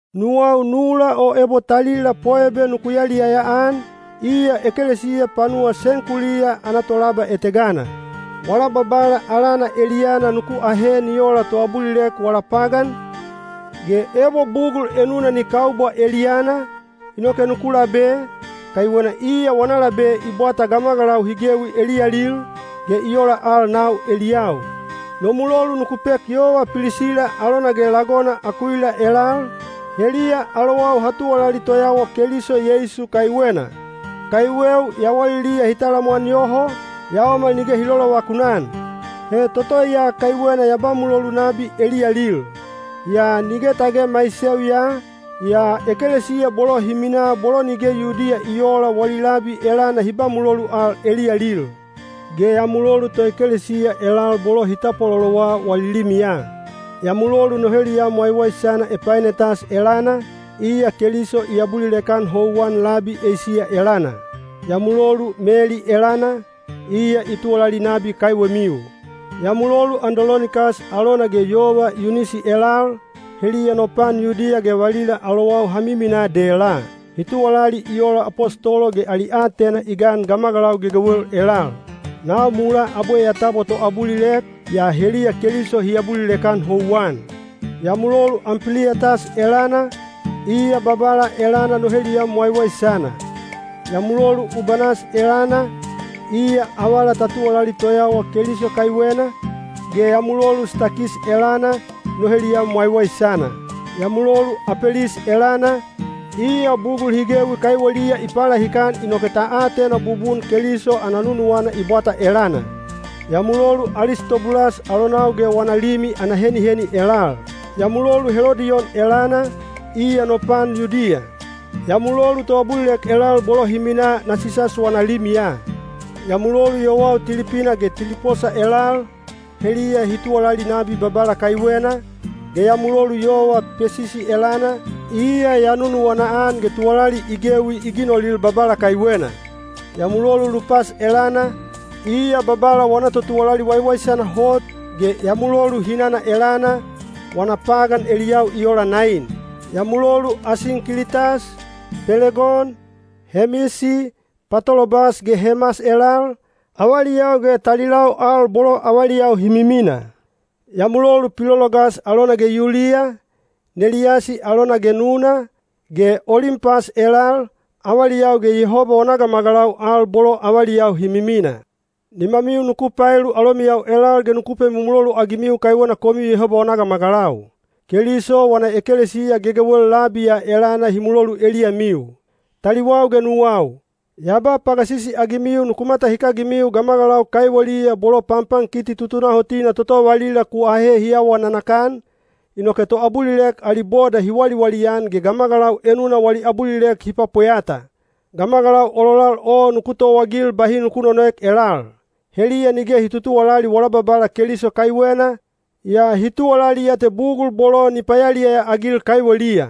Nuwau nula o ebo talila Poebe nuku yaliyaya-an, iya ekelesiya panuwa Senkuliya ana tolaba etegana. Wala Babala alana eliyana nuku ahe ni ola toabulilek wala pagan, ge ebo bugul enuna ni kaubwa eliyana, inoke nuku labe, kaiwena iya wana labe i bwata gamagalau hi gewi eliyalil, ge i ola al nau eliyau. No mulolu nuku pek yova Pilisila alona ge lagona Akuila elal, heliya alowau ha tuwalali toyawa Keliso Yeisu kaiwena. Kaiweu yawaliliya hi talamwan yoho, yaomal nige hi lolovakun-an. He toto ya kaiwena ya ba mulolu nabi eliyalil. Yaa nige tage maiseu ya, yaa ekelesiya bolo hi minaa bolo nige Yudiya i oola wali labi elana hi ba mulolu al eliyalil. Ge ya mulolu toekelesiya elal bolo hi tapwatapwalolowa wali limiya. Ya mulolu no heliyam waiwaisana Epainetas elana, iya Keliso i abulilek-an houwan labi Eisiya elana. Ya mulolu Meli elana, iya i tuwalali nabi kaiwemiu. Ya mulolu Andolonikas alona ge yova Yuniyasi elal, heliya no pan Yudiya ge valila alowau ha miminaa dela. Hi tuwalali i ola apostolo ge ali aatena i gan gamagalau gegewel elal. Nau mulaa abwe ya tabwa toabulilek, yaa heliya Keliso hi abulilek-an houwan. Ya mulolu Ampiliyatas elana, iya Babala elana no heliyam waiwaisana. Ya mulolu Ubanas elana, iya avala ta tuwalali toyawa Keliso kaiwena, ge ya mulolu Stakis elana, no heliyam waiwaisana. Ya mulolu Apelis elana, iya bugul hi gewi kaiweliya i palahikan inoke ta atena bubun Keliso ana nunuwana i bwata elana. Ya mulolu Alistobulas alonau ge wana limi ana heniheni elal. Ya mulolu Helodiyon elana, iya no pan Yudiya. Ya mulolu toabulilek elal bolo hi minaa Nasisas wana limiya. Ya mulolu yowau Tilipina ge Tiliposa elal, heliya hi tuwalali nabi Babala kaiwena, ge ya mulolu yova Pesisi elana, iya ya nunuwana-an ge tuwalali i gewi i ginolil Babala kaiwena. Ya mulolu Lupas elana, iya Babala wana totuwalali waiwaisana hot, ge ya mulolu hinana elana, wana pagan eliyau i ola nain. Ya mulolu Asinkilitas, Pelegon, Hemisi, Patolobas ge Hemas elal, avaliyau ge talilau al bolo avaliyau hi mimina. Ya mulolu Pilologas alona ge Yuliya, Neliyasi alona ge nuna, ge Olimpas elal, avaliyau ge Yehoba wana gamagalau al bolo avaliyau hi mimina. Nimamiu nuku paelu alomiyau elal ge nuku pemumulolu-agimiu kaiwena komiu Yehoba wana gamagalau. Keliso wana ekelesiya gegewel labi ya elana hi mulolu eliyamiu. Taliwau ge nuwau, ya ba pagasisi-agimiu nuku matahikagimiu gamagalau kaiweliya bolo panpankiti tutunahotina toto valila ku ahe hi awa nanakan, inoke toabulilek ali boda hi waliwali-an ge gamagalau enuna wali abulilek hi pwapweyata. Gamagalau ololal o nuku towaagil bahi nuku nonoek elal. Heliya nige hi tutuwalali wala Babala Keliso kaiwena, yaa hi tuwalali ya te bugul bolo ni payaliyaya-agil kaiweliya.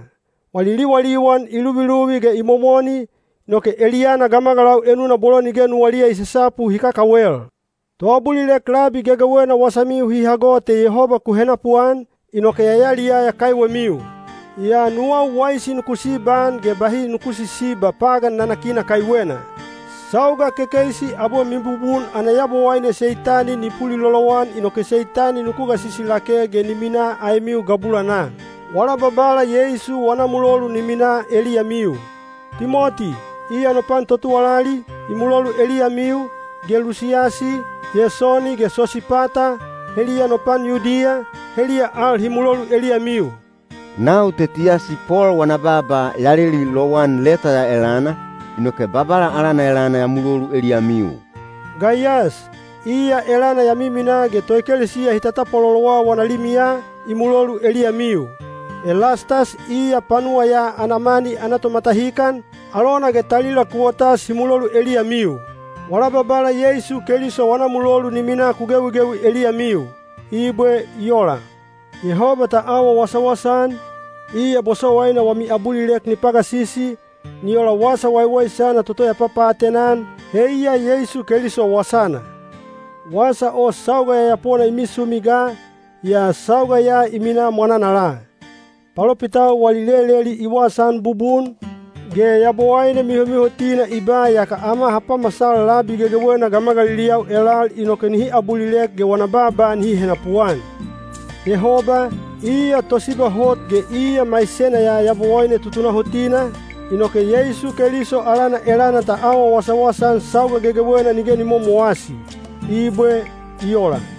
Wali liwaliwan i luviluvi ge i momoni, inoke eliyana gamagalau enuna bolo nige nuwaliya i sasapu hi kakawel. Toabulilek labi gegewena wasamiu hi hago te Yehoba ku henapuan, inoke ya yaliyaya kaiwemiu. Yaa nuwau waisi nuku sibaan ge bahi nuku sisiba pagan nanakina kaiwena. Sauga kekeisi abwe mibubun ana Yabowaine Seitani ni pulilolowan inoke Seitani nuku gasisi lake ge ni minaa aemiu gabulanaa. Wala Babala Yeisu wana mulolu ni minaa eliyamiu. Timoti, iya no pan totuwalali, i mulolu eliyamiu, ge Lusiyasi, Yesoni ge Sosipata, heliya no pan Yudiya, heliya al hi mulolu eliyamiu. Nau Tetiyasi Pol wana baaba ya leli lowan leta ya elana, inoke Babala alana elana ya mulolu eliyamiu. Gaiyas, iya elana ya miminaa ge toekelesiya hi tatapwalolowa wana limiya, i mulolu eliyamiu. Elastas iya panuwa ya ana mani ana tomatahikan, alona ge talila Kuwotas hi mulolu eliyamiu. Wala Babala Yeisu Keliso wana mulolu ni minaa ku gewigewi eliyamiu. Ibwe. I ola. Yehoba ta awa wasawasa-an, iya bosowaina wami abulilek ni pagasisi, ni ola Wasa Waiwaisana toto ya papaatena-an, heiya Yeisu Keliso wasana. Wasa o sauga yayapona i misumi ga, yaa sauga ya i minaa mwananala. Palopitau wali leleli i wasaan bubun, ge Yabowaine mihomihotina i ba yaka ama ha pamasal labi gegewena gamagaliliyau elal inoke nihi abulilek ge wana baaba nihi henapuan. Yehoba, iya tosiba hot ge iya maisena ya Yabowaine tutunahotina, inoke Yeisu Keliso alana elana ta awa wasawasa-an sauga gegewena nige ni momowasi. Ibwe. I ola.